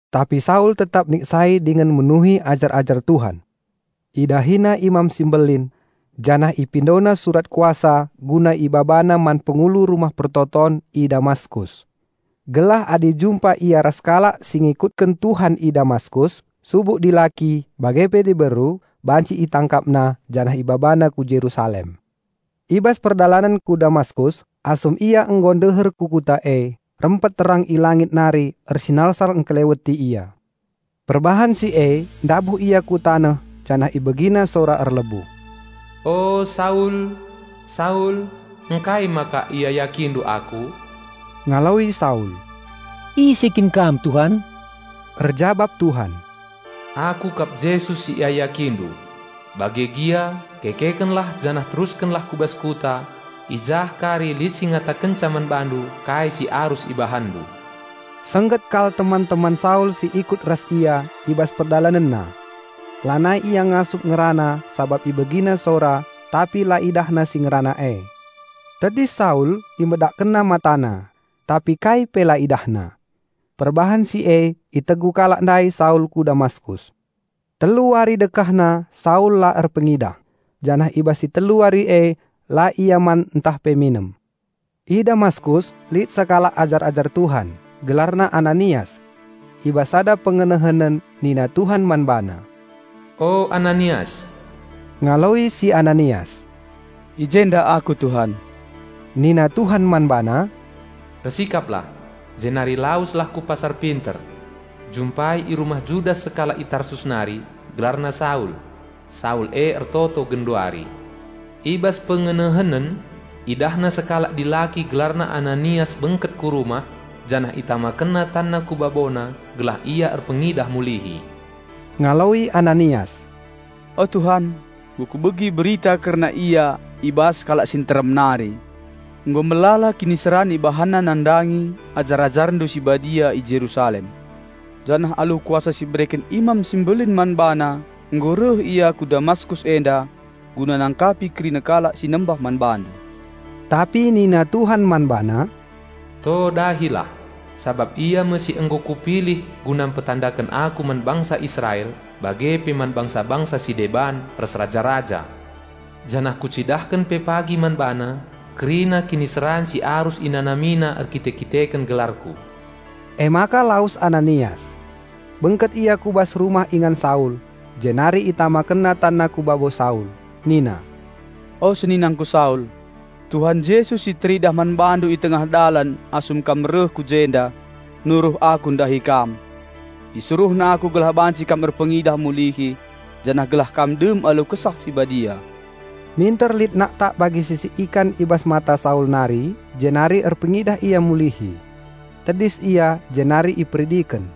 Tapi Saul tetap niksai dingen munuhi ajar-ajar Tuhan. Idahina Imam si Mbelin, janah ipindona surat kuasa guna ibabana man pengulu rumah persembahen i Damaskus. Gelah adi jumpa ia ras kalak si ngikutken Tuhan i Damaskus, subuk dilaki bage pe diberu banci itangkapna janah ibabana ku Jerusalem. I bas perdalanen ku Damaskus, asum ia nggo ndeher ku kuta e, rempet terang i langit nari ersinalsal engkeleweti ia. Perbahan si e ndabuh ia ku taneh janah ibegina sora erlebuh, "O Saul, Saul, ngkai maka iayakindu Aku?" Ngaloi Saul, "Ise kin Kam Tuhan?" Erjabap Tuhan, "Aku kap Jesus si iayakindu. Bage gia, kekekenlah janah teruskenlah ku bas kuta. I jah kari lit si ngatakenca man bandu kai si arus ibahanndu." Sengget kal teman-teman Saul si ikut ras ia i bas perdalanenna. Lanai ia ngasup ngerana sabap ibegina sora, tapi la idahna si ngerana e. Tedis Saul, imedakkenna matana, tapi kai pe la idahna. Perbahan si e itegu kalak ndai Saul ku Damaskus. Telu wari dekahna Saul la erpengidah, janah i bas si telu wari e la ia man ntah pe minem. I Damaskus, lit sekalak ajar-ajar Tuhan, gelarna Ananias. I bas sada pengenehenen nina Tuhan man bana, "O, Ananias!" Ngaloi si Ananias, "I jenda aku Tuhan." Nina Tuhan man bana, "Ersikaplah, jenari laweslah ku Pasar Pinter. Jumpai i rumah Judas sekalak i Tarsus nari, gelarna Saul. Saul e ertoto genduari. I bas pengenehenen idahna sekalak dilaki gelarna Ananias bengket ku rumah, janah itamakenna tanna ku babona gelah ia erpengidah mulihi." Ngaloi Ananias, "O Tuhan, nggo kubegi berita kerna ia i bas kalak si nterem nari. Nggo melala kiniseran ibahanna nandangi ajar-AjarNdu si badia i Jerusalem. Janah alu kuasa si ibereken imam si mbelin man bana nggo reh ia ku Damaskus enda guna nangkapi kerina kalak si nembah man BaNdu." Tapi nina Tuhan man bana, "To dahilah, sabap ia me si nggo Kupilih guna mpetandaken Aku man bangsa Israel bage pe man bangsa-bangsa si deban ras raja-raja. Janah Kucidahken pe pagi man bana, kerina kiniseran si arus inanamina erkite-kiteken gelarKu." Emaka lawes Ananias. Bengket ia ku bas rumah ingan Saul, jenari itamakenna tanna ku babo Saul. Nina, "O seninangku Saul, Tuhan Jesus si teridah man bandu i tengah dalan asum kam reh ku jenda, nuruh aku ndahi kam. IsuruhNa aku gelah banci kam erpengidah mulihi janah gelah kam dem alu Kesah Si Badia." Minter lit naktak bagi sisik ikan i bas mata Saul nari, jenari erpengidah ia mulihi. Tedis ia jenari iperidiken.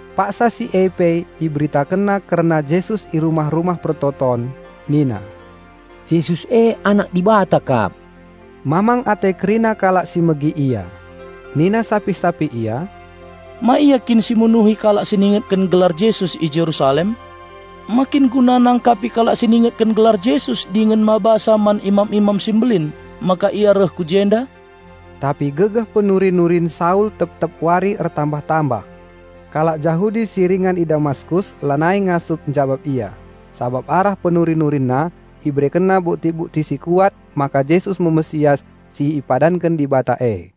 Paksa si e pe iberitakenna kerna Jesus i rumah-rumah persembahen. Nina, "Jesus e Anak Dibata kap." Mamang ate kerina kalak si megi ia. Nina sapih-sapih ia, "Ma ia kin si munuhi kalak si ningetken gelar Jesus i Jerusalem? Ma kin guna nangkapi kalak si ningetken gelar Jesus dingen mabasa man imam-imam si mbelin maka ia reh ku jenda?" Tapi gegeh penuri-nurin Saul tep-tep wari ertambah-tambah. Kalak Jahudi si ringan i Damaskus lanai ngasup njabap ia, sabap arah penuri-nurinna iberekenna bukti-bukti si kuat maka Jesus me Raja Penampat si ipadanken Dibata e.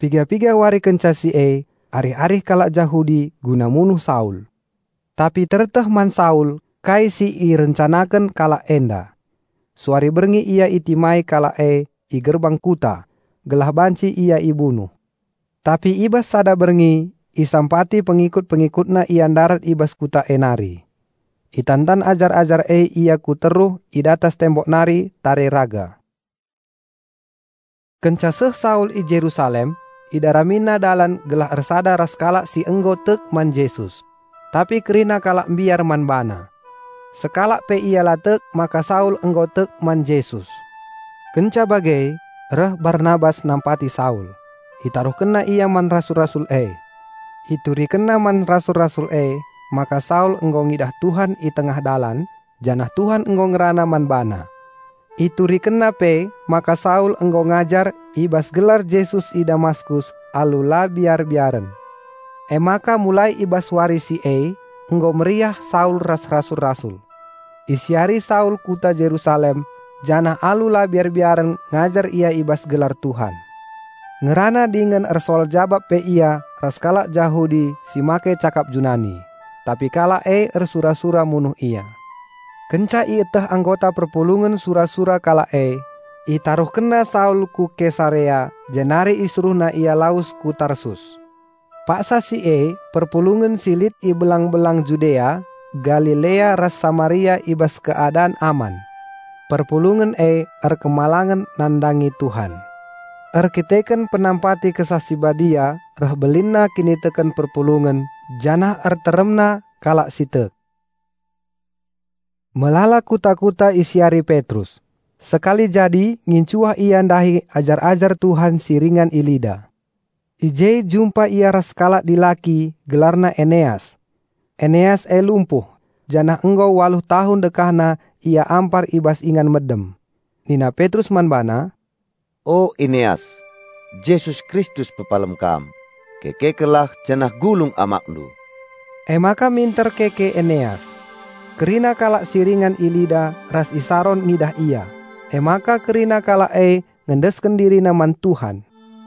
Piga-piga wari kenca si e, arih-arih kalak Jahudi guna munuh Saul. Tapi tereteh man Saul kai si irencanaken kalak enda. Suari berngi ia itimai kalak e i gerbang kuta, gelah banci ia ibunuh. Tapi i bas sada berngi isampati pengikut-pengikutna ia ndarat i bas kuta e nari. Itantan ajar-ajar e ia ku teruh i datas tembok nari tare raga. Kenca seh Saul i Jerusalem, idaramina dalan gelah ersada ras kalak si nggo tek man Jesus. Tapi kerina kalak mbiar man bana. Sekalak pe ia la tek maka Saul nggo tek man Jesus. Kenca bage reh Barnabas nampati Saul; itaruhkenna ia man rasul-rasul e. Iturikenna man rasul-rasul emaka Saul nggo ngidah Tuhan i tengah dalan, janah Tuhan nggo ngerana man bana. Iturikenna pe maka Saul nggo ngajar i bas gelar Jesus i Damaskus alu la biar-biaren. Emaka mulai i bas wari si e nggo meriah Saul ras rasul-rasul. Isiari Saul kuta Jerusalem, janah alu la biar-biaren ngajar ia i bas gelar Tuhan. Ngerana dingen ersoal-jabap pe ia ras kalak Jahudi si make cakap Junani; tapi kalak e ersura-sura munuh ia. Kenca ieteh anggota perpulungen sura-sura kalak e, itaruhkenna Saul ku Kesarea jenari isuruhna ia lawes ku Tarsus. Paksa si e perpulungen si lit i belang-belang Judea, Galilea ras Samaria i bas keadan aman. Perpulungen e erkemalangen nandangi Tuhan. Erkiteken penampati Kesah Si Badia reh belinna kiniteken perpulungen janah ertambahna pe jumlahna. Melala kuta-kuta isiari Petrus. Sekali jadi ngincuah ia ndahi ajar-ajar Tuhan si ringan i Lida. I je jumpa ia ras sekalak dilaki gelarna Eneas. Eneas e lumpuh, janah nggo waluh tahun dekahna ia ampar i bas ingan medem. Nina Petrus man bana, "O Eneas, Jesus Kristus pepalem kam, kekekenlah janah gulung amakndu." Emaka minter keke Eneas. Kerina kalak si ringan i Lida ras i Saron ngidah ia, emaka kerina kalak e ngendesken dirina man Tuhan.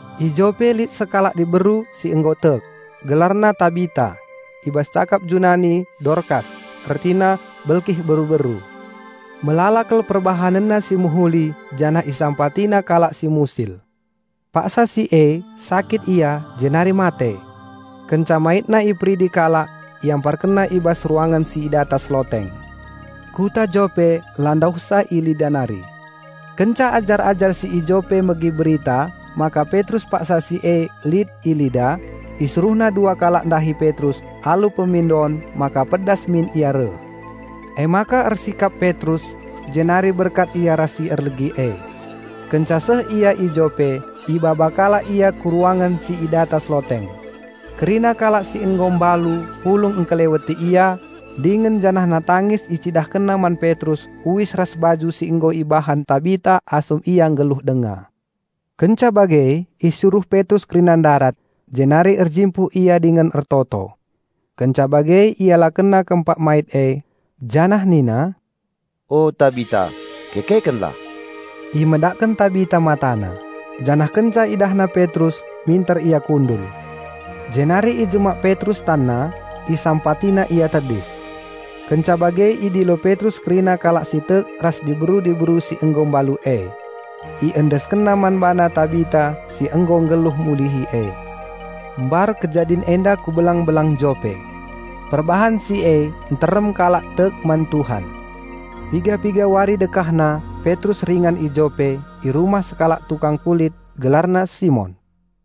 I Jope lit sekalak diberu si nggo tek, gelarna Tabita (I bas cakap Junani: Dorkas, ertina belkih beru-beru). Melala kal perbahanenna si mehuli janah isampatina kalak si musil. Paksa si e sakit ia jenari mate. Kenca maitna iperidi kalak, iamparkenna i bas ruangen si i datas loteng. Kuta Jope la ndauhsa i Lida nari. Kenca ajar-ajar si i Jope megi berita maka Petrus paksa si e lit i Lida, isuruhna dua kalak ndahi Petrus alu pemindon maka pedas min ia reh. Emaka ersikap Petrus, jenari berkat ia ras si erlegi e. Kenca seh ia i Jope, ibaba kalak ia ku ruangen si i datas loteng. Kerina kalak si nggo mbalu pulung engkeleweti ia, dingen janahna tangis icidahkenna man Petrus uis ras baju si nggo ibahan Tabita asum ia nggeluh denga. Kenca bage isuruh Petrus kerina ndarat, jenari erjimpuh ia dingen ertoto. Kenca bage ialekenna kempak mait e, janah nina, "O Tabita, kekekenlah!" Imedakken Tabita matana, janah kenca idahna Petrus minter ia kundul. Jenari ijemak Petrus tanna, isampatina ia tedis. Kenca bage idilo Petrus kerina kalak si tek ras diberu-diberu si nggo mbalu e. Iendeskenna man bana Tabita si nggo nggeluh mulihi e. Mbar kejadin enda ku belang-belang Jope. Perbahan si e nterem kalak tek man Tuhan. Piga-piga wari dekahna Petrus ringan i Jope, i rumah sekalak tukang kulit, gelarna Simon.